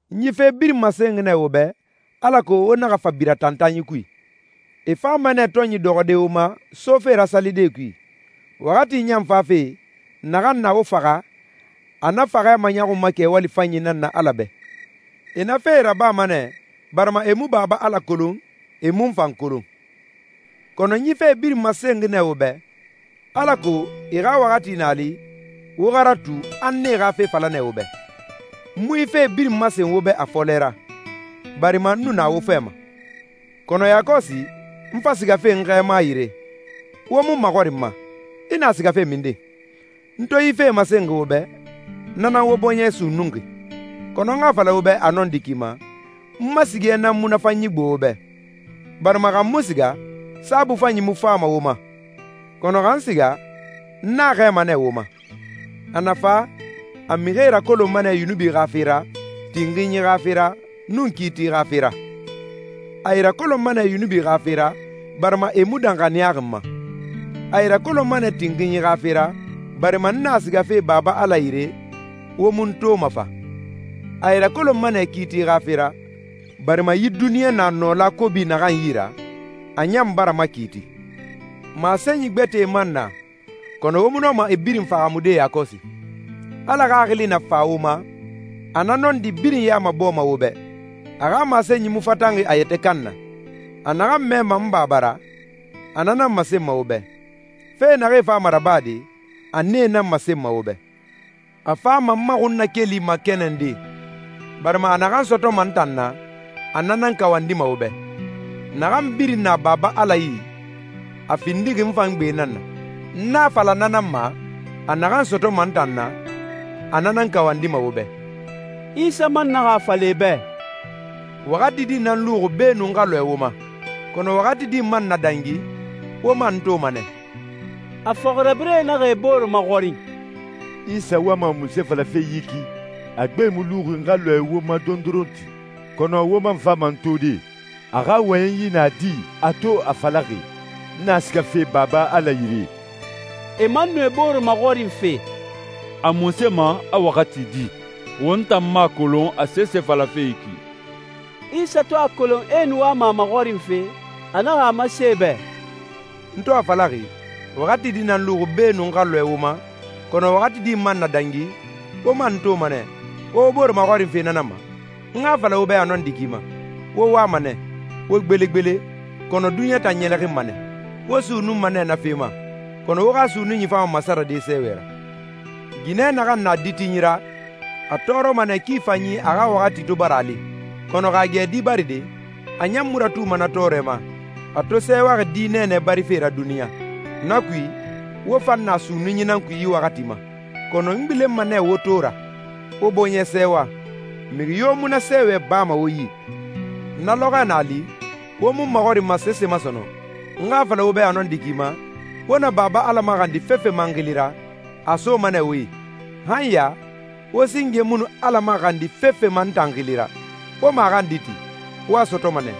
«N yi fe birin masenxi nɛ wo bɛ, alako wo naxa fa bira tantanyi kui. E fama nɛ tɔnyi dɔxɔde wo ma, sofe ra salidee kui. Waxati ɲan fafe, naxan na wo faxa, a na faxɛ maɲɔxunma kɛwali fanyi nan na Ala bɛ. E na fee rabama nɛ, barima e mu Baba Ala kolon, e mu n fan kolon. Kɔnɔ n yi fee birin masenxi nɛ wo bɛ, alako e waxati na a li, wo xa ratu, a n e xa fe fala nɛ wo bɛ.» «N mu yi fe birin masen wo bɛ a fɔlɛ ra, barima n nu na wo fɛ ma. Kɔnɔ yakɔsi, n fa sigafe n Xɛɛma yire, wo mu n maxɔrinma, ‹I na sigafe minden?› N to yi fee masenxi wo bɛ, na nan wo bɔɲɛ sunnunxi. Kɔnɔ n xa a fala wo bɛ a nɔndi ki ma, n ma sigɛ nan munafanyi gbo wo bɛ, barima xa n mu siga, Saabui Fanyi mu fama wo ma. Kɔnɔ xa n siga, n a xɛɛma nɛ wo ma. A na fa, a mixie rakolonma nɛ yunubi xa fe ra, tinxinyi xa fe ra, nun kiiti xa fe ra. A e rakolonma nɛ yunubi xa fe ra, barima e mu danxaniyaxi n ma. A e rakolonma nɛ tinxinyi xa fe ra, barima n na sigafe Baba Ala yire, wo mu n toma fa. A e rakolonma nɛ kiiti xa fe ra, barima yi duniɲa na nɔla kobi naxan yi ra, a ɲan bara makiiti.» «Masenyi gbɛtɛe man na, kɔnɔ wo mu nɔma e birin fahaamude yakɔsi. Ala Xaxili na fa wo ma, a na nɔndi birin ya mabɔɔma wo bɛ. A xa masenyi mu fatanxi a yɛtɛ kan na. A naxan mɛma n Baba ra, a na nan masenma wo bɛ. Fe naxee fama rabade, a nee nan masenma wo bɛ. A fama n ma xunnakeli makɛnɛnde, barima a naxan sɔtɔma n tan na, a na nan kawandima wo bɛ. Naxan birin na Baba Ala yi, a findixi n fan gbe nan na. N a fala na nan ma, ‹A naxan sɔtɔma n tan na, a na nan kawandima wo bɛ.›» Isa man naxa a fala e bɛ, «Waxati di nan luxi beenun n xa lɔɛ wo ma, kɔnɔ waxati di man na dangi, wo man n toma nɛ.» A fɔxirabirɛe naxa e bore maxɔrin, «Isa wama munse falafe yi ki, ‹A gbe mu luxi n xa lɔɛ wo ma dondoronti, kɔnɔ wo man fama n tode.› A xa wɔyɛnyi na di a to a falaxi, ‹N na sigafe Baba Ala yire?›» E man nu e bore maxɔrinfe, «A munse ma, a ‹waxati di›? Won tan mu a kolon a sese falafe yi ki.» Isa to a kolon a e nu wama a maxɔrinfe, a naxa a masen e bɛ, «N to a falaxi, ‹Waxati di nan luxi beenun n xa lɔɛ wo ma, kɔnɔ waxati di man na dangi, wo man n toma nɛ,› wo wo bore maxɔrinfe na nan ma? N xa a fala wo bɛ a nɔndi ki ma, wo wama nɛ, wo gbelegbele, kɔnɔ duniɲa tan ɲɛlɛxinma nɛ. Wo sunnunma nɛ na fe ma, kɔnɔ wo xa sunnunyi fama masarade sɛɛwɛ ra. Ginɛ naxan na ditinyi ra, a tɔɔrɔma nɛ ki fanyi a xa waxati to bara a li. Kɔnɔ xa a gɛ di baride, a ɲan mu ratuma na tɔɔrɛ ma, a to sɛɛwaxi di nɛɛnɛ barife ra duniɲa. Na kui, wo fan na sunnunyi nan kui yi waxati ma. Kɔnɔ n gbilenma nɛ wo to ra, wo bɔɲɛ sɛɛwa, mixi yo mu na sɛɛwɛ bama wo yi. Na lɔxɔɛ na a li, wo mu n maxɔrinma sese ma sɔnɔn. N xa a fala wo bɛ a nɔndi ki ma, wo na Baba Ala maxandi fefe ma n xili ra, a a soma nɛ wo yi. Han ya, wo singe mu nu Ala maxandi fefe ma n tan xili ra. Wo maxandi ti. Wo a sɔtɔma nɛ,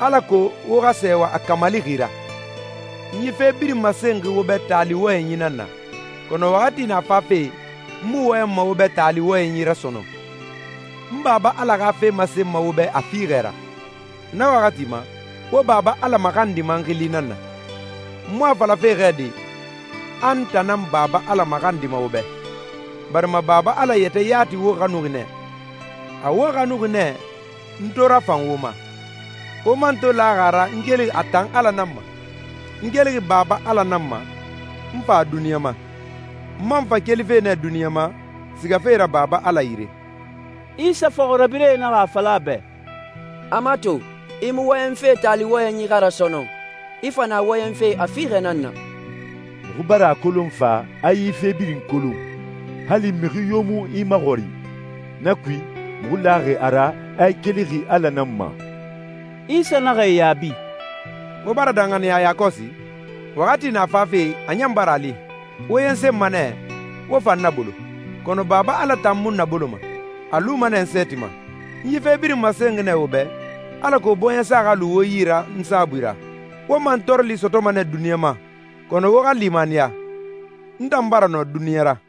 alako wo xa sɛɛwa a kamalixi ra.» «N yi fe birin masenxi wo bɛ taali wɔyɛnyi nan na, kɔnɔ waxati na fafe, n mu wɔyɛnma wo bɛ taali wɔyɛnyi ra sɔnɔn, n Baba Ala xa fe masen wo bɛ a fiixɛ ra. Na waxati ma, wo Baba Ala maxandima n xili nan na. N mu a falafe xɛ de, a n tan nan Baba Ala maxandima wo bɛ, barima Baba Ala yɛtɛ yati wo xanuxi nɛ. A wo xanuxi nɛ n to rafan wo ma, wo man to laxi a ra a n kelixi a tan Ala nan ma. N kelixi Baba Ala nan ma, n fa duniɲa ma. N man fa kelife nɛ duniɲa ma, sigafe ra Baba Ala yire.» Isa fɔxirabirɛe naxa a fala a bɛ, «A mato, i mu wɔyɛnfe taali wɔyɛnyi xa ra sɔnɔn, i fa na wɔyɛnfe a fiixɛ nan na! Muxu bara a kolon fa, a i fe birin kolon, hali mixi yo mu i maxɔrin. Na kui, muxu laxi a ra a i kelixi Ala nan ma.» Isa naxa e yaabi, «Wo bara danxaniya yakɔsi? Waxati na fafe, a ɲan bara a li, wo yensenma nɛ, wo fa n nabolo. Kɔnɔ Baba Ala tan mu n naboloma. A luma nɛ n sɛɛti ma. N yi fe birin masenxi nɛ wo bɛ, alako bɔɲɛsa xa lu wo yi ra n saabui ra. Wo mantɔɔrɔli sɔtɔma nɛ duniɲa ma, kɔnɔ wo xa limaniya, n tan bara nɔ duniɲa ra.»